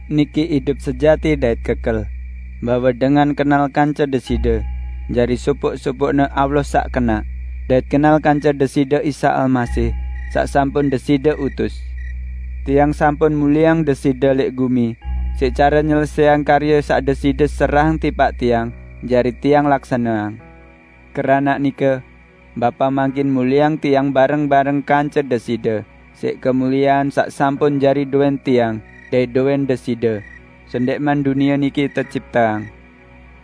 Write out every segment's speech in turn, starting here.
Niki idup sejati dait kekel; bahwe dengan kenal kance Deside, jari sopoq-sopoqne Allah saq kenaq, dait kenal kance Deside Isa Almasih saq sampun Deside utus. Tiang sampun mulieang Deside lẽq gumi siq care nyelesẽang karye saq Deside serahang tipaq Tiang jari Tiang laksaneang. Keranaq nike, Bapa, mangkin mulieang Tiang bareng-bareng kance Deside siq kemuliean saq sampun jari dowẽn Tiang dait dowẽn Deside sendẽqman dunie niki tecipteang.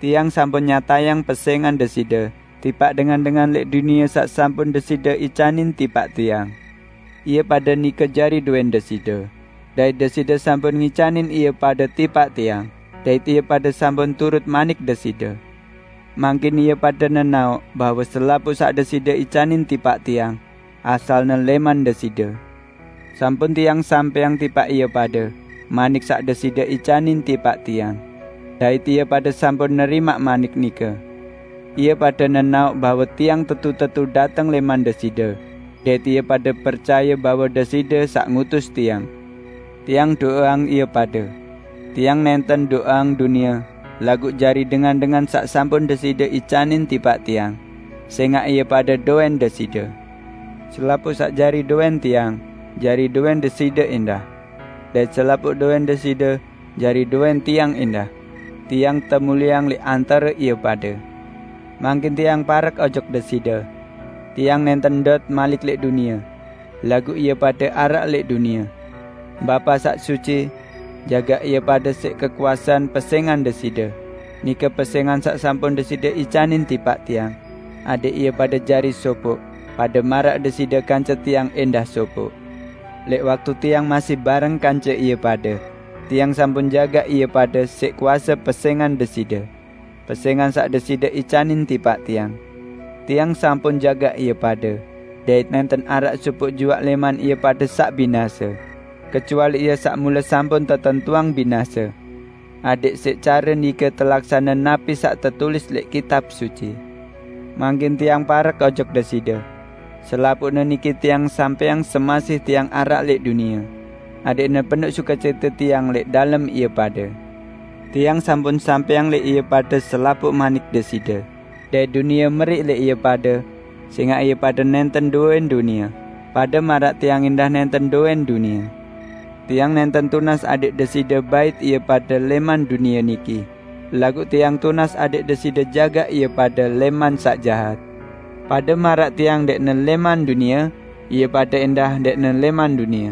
Tiang sampun nyatayang pesẽngan Deside tipaq dengan-dengan lẽq dunie saq sampun Deside icanin tipaq Tiang. Ie pade nike jari dowẽn Deside, dait Deside sampun ngicanin ie pade tipaq Tiang dait ie pade sampun turut manik Deside. Mangkin ie pade nenaoq bahwe selapuq saq Deside icanin tipaq Tiang asalne lẽman Deside. Sampun Tiang sampẽang tipaq ie pade manik saq Deside icanin tipaq Tiang; dait ie pade sampun nerimaq manik nike. Ie pade nenaoq bahwe Tiang tetu-tetu dateng lẽman Deside dait ie pade percaye bahwe Deside saq ngutus Tiang. Tiang do'eang ie pade. Tiang nẽnten do'eang dunie laguq jari dengan-dengan saq sampun Deside icanin tipaq Tiang, sẽngaq ie pade dowẽn Deside. Selapuq saq jari dowẽn Tiang, jari dowẽn Deside ẽndah. Dait selapuq dowẽn Deside jari dowẽn Tiang ẽndah. Tiang temulieang lẽq antare ie pade. Mangkin Tiang parek ojok Deside. Tiang nẽnten ndot malik lẽq dunie; laguq ie pade araq lẽq dunie. Bapa, saq suci! Jagaq ie pade siq kekuasean pesẽngan Deside, nike pesẽngan saq sampun Deside icanin tipaq Tiang -- adẽq ie pade jari sopoq, pade maraq Deside kance Tiang ẽndah sopoq. Lẽq waktu Tiang masih bareng kance ie pade, Tiang sampun jagaq ie pade siq kuase pesẽngan Deside -- pesẽngan saq Deside icanin tipaq Tiang. Tiang sampun jagaq ie pade, dait nẽnten araq sopoq juaq lẽman ie pade saq binase; kecuali ie saq mule sampun tetentuang binase. Adẽq siq care nike telaksane napi saq tetulis lẽq Kitab Suci. Mangkin Tiang parek ojok Deside. Selapuqne niki Tiang sampẽang semasih Tiang araq lẽq dunie; adẽqne penoq sukecite Tiang lẽq dalem ie pade. Tiang sampun sampẽang lẽq ie pade selapuq manik Deside, dait dunie meriq lẽq ie pade, sẽngaq ie pade nẽnten dowẽn dunie, pade maraq Tiang ẽndah nẽnten dowẽn dunie. Tiang nẽnten tunas adẽq Deside bait ie pade lẽman dunie niki, laguq Tiang tunas adẽq Deside jagaq ie pade lẽman saq jahat. Pade maraq Tiang ndẽqne lẽman dunie, ie pade ẽndah ndẽqne lẽman dunie.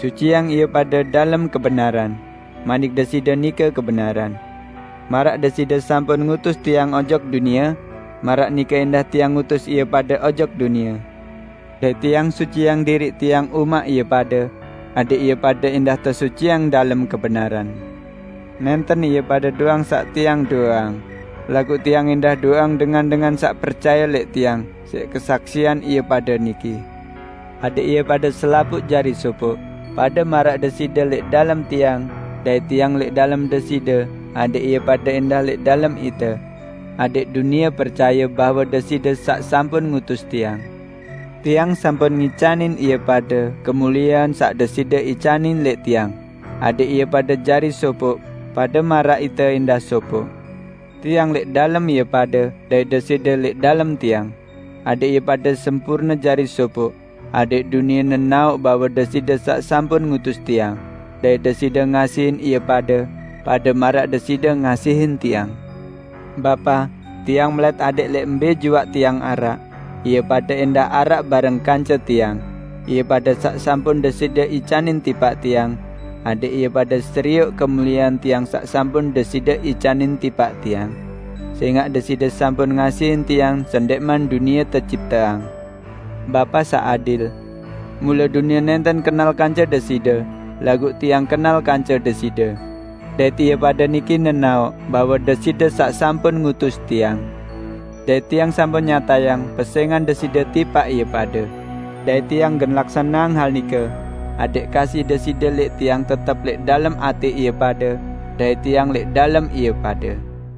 Suciang ie pade dalem kebenaran; manik Deside nike kebenaran. Maraq Deside sampun ngutus Tiang ojok dunie, maraq nike ẽndah Tiang ngutus ie pade ojok dunie; dait Tiang suciang diriq Tiang umaq ie pade, adẽq ie pade ẽndah tesuciang dalem kebenaran. Nẽnten ie pade doang saq Tiang do'eang, laguq Tiang ẽndah do'eang dengan-dengan saq percaye lẽq Tiang siq kesaksian ie pade niki; adẽq ie pade selapuq jari sopoq, pade maraq Deside lẽq dalem Tiang, dait Tiang lẽq dalem Deside, adẽq ie pade ẽndah lẽq dalem Ite, adẽq dunie percaye, bahwe Deside saq sampun ngutus Tiang. Tiang sampun ngicanin ie pade kemuliean saq Deside icanin lẽq Tiang, adẽq ie pade jari sopoq, pade maraq Ite ẽndah sopoq; Tiang lẽq dalem ie pade, dait Deside lẽq dalem Tiang; adẽq ie pade sempurne jari sopoq, adẽq dunie nenaoq bahwe Deside saq sampun ngutus Tiang, dait Deside ngasihin ie pade, pade maraq Deside ngasihin Tiang. Bapa, Tiang melẽt adẽq lẽq mbẽ juaq Tiang araq, ie pade ẽndah araq bareng kance Tiang, ie pade saq sampun Deside icanin tipaq Tiang, adẽq ie pade serioq kemuliean Tiang saq sampun Deside icanin tipaq Tiang, sẽngaq Deside sampun ngasihin Tiang sendẽqman dunie tecipteang. Bapa saq adil! Mule dunie nẽnten kenal kance Deside, laguq Tiang kenal kance Deside; dait ie pade niki nenaoq, bahwe Deside saq sampun ngutus Tiang, dait Tiang sampun nyatayang pesẽngan Deside tipaq ie pade; dait Tiang gen laksaneang hal nike, adẽq kasih Deside lẽq Tiang tetep lẽq dalem atẽ ie pade dait Tiang lẽq dalem ie pade."